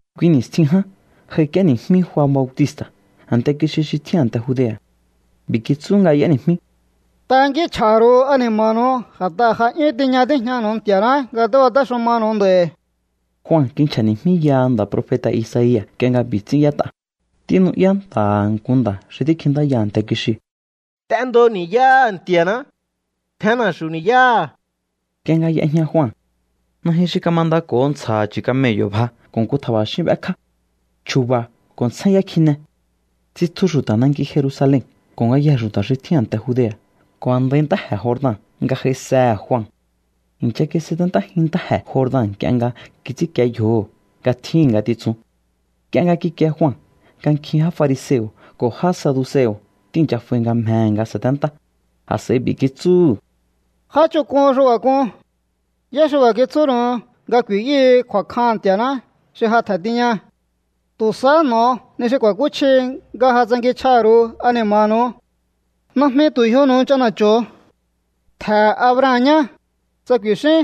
Kui ni̱stjin ján j'aik'íéni̱jmí Jua Bautista̱ a̱nte kixi xi tjín a̱nte Judea̱. B'i̱ kitsú nga y'éni̱jmí: —Tankínchj'a̱ha̱ ru̱u ani̱ma̱nu̱u, a̱t'aha̱ ja 'yún tiña tíjñanu̱u Nti̱a̱ná nga tíbatéxumanu̱u nd'a̱i̱. Jua kinchja̱ni̱jmíyaha nda̱ profeta̱ Isaia̱ nk'ie nga b'i̱ ts'ín y'ét'a: Tínu'yá nta̱ha̱ nku nda̱ xi tíkjintáya a̱nte kixiu̱: “T'endo ni̱yáha̱ Nti̱a̱ná. Tjen na̱xu̱u ni̱yáha̱.” Nk'ie nga y'ejña Jua, najyun xi kamandako̱ho ntsja̱ha̱ chu̱ camello̱ bja ko̱ nku tja̱ba̱xín b'ékjá. Chju̱ba̱ ko̱ ntsjényá kjine. Tsitju xu̱ta̱ nanki Jerusalen ko̱ ngayjee̱ xu̱ta̱ xi tjín a̱nte Judea̱ ko̱ a̱ndai ntáje̱ Jordan nga j'aisehe̱ Jua. I̱ncha kisaténtájin ntáje̱ Jordan nk'ie nga kits'ínkie yjoho̱ nga tjíhi̱n ngatitsun. Nk'ie nga kikie Jua nga nkjin já fariseo̱ ko̱ já saduseo̱ tíi̱ncha f'ai nga mjehe̱ nga sa̱téntá, a̱s'a̱i b'i̱ kitsúhu̱: —¡Já ch'onk'un xi b'a̱ k'un! ¿Yá xi b'a̱ kitsúnu̱u nga ku̱i̱yúhu̱u kju̱a̱kjaha̱n Nti̱a̱ná xi ja tje̱n tiña? Tu̱ sahá n'o̱o ni xi ku̱a̱kúchji nga ja tsankinchj'aha̱ ru̱u ani̱ma̱nu̱u. Najmi tu̱ yjonu̱u ch'ana̱cho̱ho̱o: “Ntje̱he̱ Abraham ñá”, tsa ku̱i̱xíún.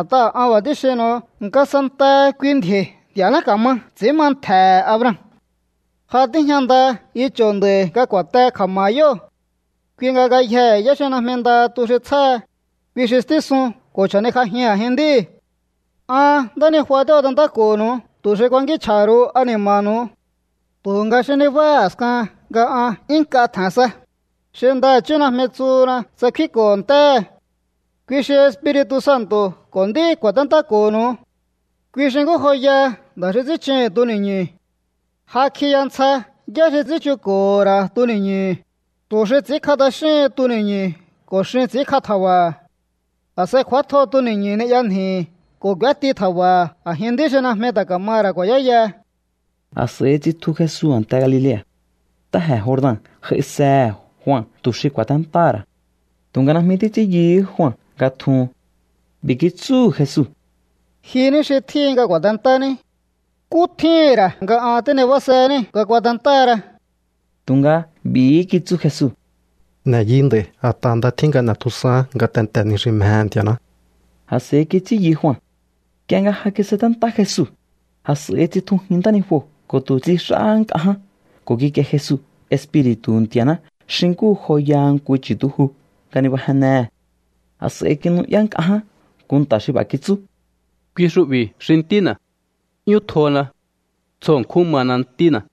A̱t'aha̱ an b'a̱ tíxinnu̱u nga santaha kui ndji̱o̱i̱ Nti̱a̱ná ka̱ma ts'i̱ín ma ntje̱he̱ Abraham. Ja tíjña nda icho̱ nd'a̱i̱ nga ku̱a̱te kja̱ma̱ha̱ yóo̱. Kui nga ngayjee̱ yá xi najmi nda tu xi tsjáha, kui xi stísun ko̱ chja̱nikj'ajin a̱jin nd'íu̱. ’An ntánijua tíbatentáko̱ho̱nu̱u tu̱ xi ku̱a̱kínchj'a̱ha̱ ru̱u ani̱ma̱nu̱u. Tu̱nga xi nibáha a̱skahan nga an 'yún nk'a tje̱n sa, xi ndaha̱chí najmi tsuhuna tsa kfínko̱ho̱ ntéhe̱. Kui xi Espiri̱tu̱ Santo̱ ko̱ nd'í ku̱a̱téntáko̱ho̱nu̱u. Kui xi nkú joyaha nda̱ xi ts'ín chuhu̱n tuni̱ñu̱. Ja kjiya ntsja yá xi ts'ín chunko̱ho̱ ra̱ tuni̱ñu̱hu̱, tu̱ xi ts'i̱ínkj'a t'axíhin tuni̱ñu̱ ko̱ xin ts'i̱ínkj'a tja̱ba̱ha̱. A̱s'a̱i kj'u̱átjo tuni̱ñu̱ ni'ya nji̱hi̱ ko̱ k'u̱éti tja̱ba̱ha̱ a̱jin nd'í xi najmi ta̱ ka̱maha̱ ra̱ ku̱a̱yáyaha. A̱s'a̱i tsitju Jesu a̱nte Galilea̱. Ntáje̱ Jordan j'aisehe̱ Jua tu̱ xi ku̱a̱téntáha̱ ra̱. Tu̱nga najmi títs'ín yuhú Jua nga tjuhun. B'i̱ kitsúhu̱ Jesu: —Ji ní xi tjíhin nga ku̱a̱tentání. ¿Nkú tjíhi̱n ra̱ nga an tínibásehení nga kuatentáhara? Tu̱nga b'i̱hí kitsú Jesu: —N'e̱ yi nd'a̱i̱, a̱t'aha̱ nda tjín nga n'e̱tjusaán ngatentee̱ ni xi mjehe̱ Nti̱a̱ná. A̱s'a̱i kits'ín yu Jua. Nk'ie nga ja kisaténtá Jesu, a̱s'a̱i tsitjujin ntánijuo̱ ko̱ tu̱ tsix'áhá nk'a ján ko̱ kikie Jesu Espiri̱tu̱hu̱ Nti̱a̱ná xi nkú joyaha nku chu̱tuju nga nibajennehe̱. A̱s'a̱i kinu'yá nk'a ján nku nta̱ xi b'a̱ kitsú: —Kui xu'bi̱ xi Ntína̱. 'Yún tjona. Tsjo ṉkjún mana Ntína̱.